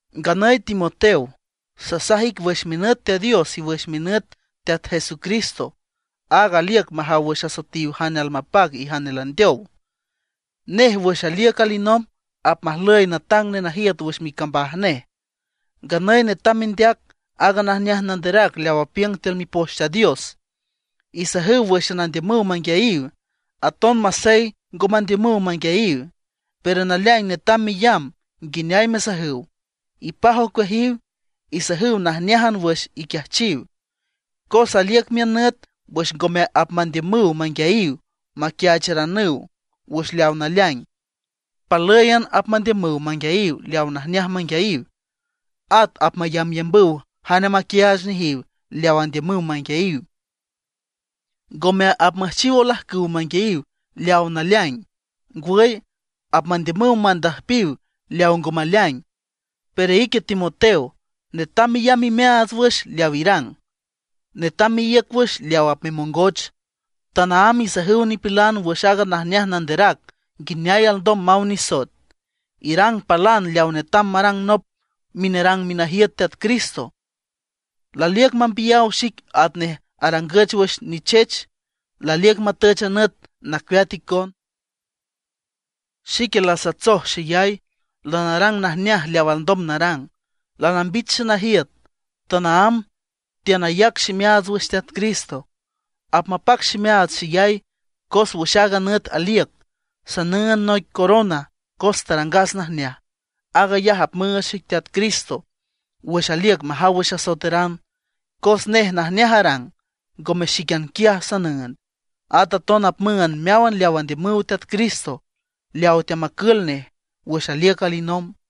Nganüy Timoteo, sasaj ic wüx minüt Teat Dios y wüx minüt Teat Jesucristo, aag aliüc majaw wüx asoetiw jane almapac y jane landeow. Nej wüx aliüc alinomb apmajlüy natang nenajiüt wüx micambaj nej. Nganüy netam mendeac aaga najneaj nanderac leaw apiüng tiül Mipoch Teat Dios. Isajüw wǘxan andiümüw manguiayiw, aton masey ngo mandiümüw manguiayiw. Pero naleaing netam meyamb nguineay mesajüw, ipaj ocueajiw, isajüw najneájan wüx iquiajchiw. Cos aliüc miün nüt wüx ngome apmandiümüw manguiayiw maquiaacharanüw wüx leawa naleaing, palǘyan apmandiümüw manguiayiw leawa najneaj manguiayiw. At apmayambyambüw jane maquiaach nejiw leawa andiümüw manguiayiw. Ngome apmüjchiw olajcüw manguiayiw leawa naleaing; ngwüy, apmandiümüw mandüjpiw leawa ngo maleaing. Pero ique Timoteo, netam meyamb imeaats wüx leaw irang. Netam meíüc wüx leaw apmemongoch. Tanaámb isajüw nipilan wüx aaga najneaj nanderac nguineay alndom maw nisoet. Irang palan leawa netam marang nop minerang minajiüt Teat Cristo. Laliüc mambiyaw xic atnej arangüch wüx nichech; laliüc matüch a nüt nacueat icon. Xique lasatsoj xeyay, lanarang najneaj leaw alndom narang. Lanambich xenajiüt, tanaámb teanayac ximeaats wüx Teat Cristo. Apmapac ximeaats xeyay, cos wüx aaga nüt aliüc, sanüünd noic corona cos tarangas najneaj. Aag ayaj apmüüch xic Teat Cristo wüx aliüc majaw wüx asoetaran, cos nej najneaj arang. Ngome xíquian quiaj sanüünd, at aton apmüünd meáwan leaw andiümüw Teat Cristo, leaw teamacül nej wüx aliüc alinomb.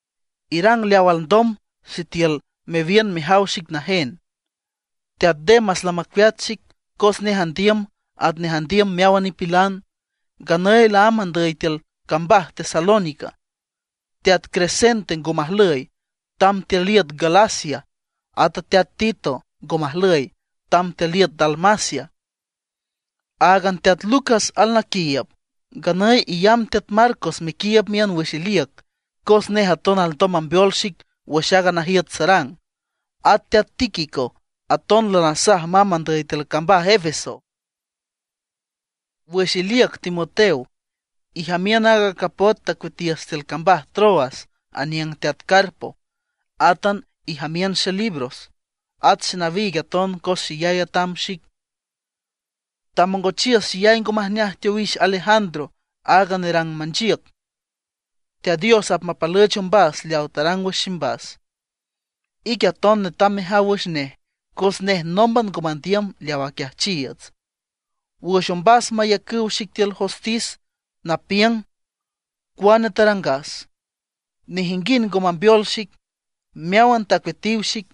Irang leaw alndom sitiül mewiün mejaw xic najen. Teat Demas lamacueat xic, cos nej andiüm atnej andiüm meáwan nipilan. Nganüy laámb andüy tiül cambaj Tesalónica. Teat Crescente ngo majlüy, tamb tiül iüt Galacia. Ata teat Tito ngo majlüy, tamb tiül iüt Dalmacia. Áagan teat Lucas alnaquiiüb. Nganüy iyamb teat Marcos mequiiüb miün wüx iliüc, cos nej aton alndom mambeol xic wüx aaga najiüt sarang. At teat Tíquico aton lanasaj mamb andüy tiül cambaj Efeso. Wüx iliüc Timoteo, ijamiün aaga capot tacueatiüs tiül cambaj Troas aniüng teat Carpo. Átan ijamiün xelibros, at xenawiig aton cos xeyay atam xic. Tamongochiüs xeyay ngo majneaj teowix Alejandro, aaga nerang manchiüc. Teat Dios apmapalüch ombas leawa tarang wüx ximbas. Ique aton netam mejaw wüx nej, cos nej nómban ngo mandiüm leaw aquiajchiiüts. Wüx ombas mayacüw xic tiül jostis napiüng cuane tarangas, nejinguind ngo mambeol xic, meáwan tacueatiw xic.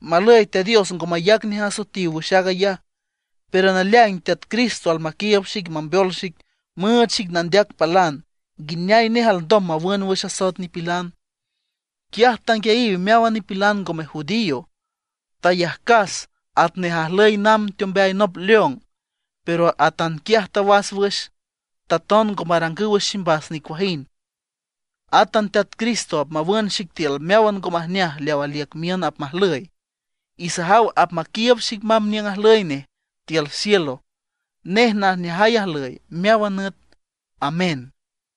Malüy Teat Dios ngo mayac nej asoetiw wüx aag ayaj. Pero naleaing Teat Cristo almaquiiüb xic mambeol xic müüch xic nandeac palan nguineay nej alndom mawün wüx asoet nipilan. Quiaj tanguiayiw meáwan nipilan ngome judío. Tayajcas atnej ajlüy namb teombeay nop león; pero atanquiaj tawas wüx, taton ngo marangüw wüx ximbas nicuajind. Átan Teat Cristo apmawün xic tiül meáwan ngo majneaj leaw aliüc miün apmajlüy; y sajaw apmaquiiüb xic namb niüng ajlüy nej tiül cielo. Nej najneajay ajlüy meáwan nüt. ¡Amén!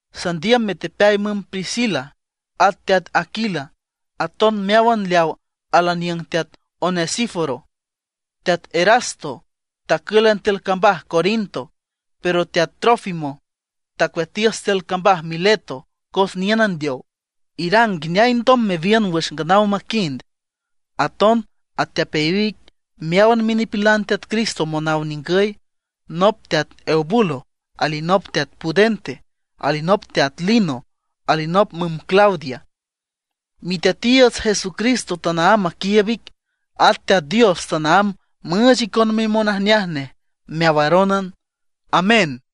Sandiüm metepeay müm Priscila at teat Aquila, aton meáwan leaw alaniüng teat Onesíforo. Teat Erasto tacǘlan tiül cambaj Corinto; pero teat Trófimo tacueatiüs tiül cambaj Mileto, cos niün andeow. Irang nguineay alndom mewiün wüx nganaw maquind. Aton atepeayiw ic meáwan minipilan Teat Cristo monaw ningüy, nop teat Eubulo, alinop teat Pudente, alinop teat Lino, alinop müm Claudia. Miteatiiüts Jesucristo tanaámb maquiiüb ic; at Teat Dios tanaámb müüch icon mimonajneaj nej meawarónan. ¡Amén!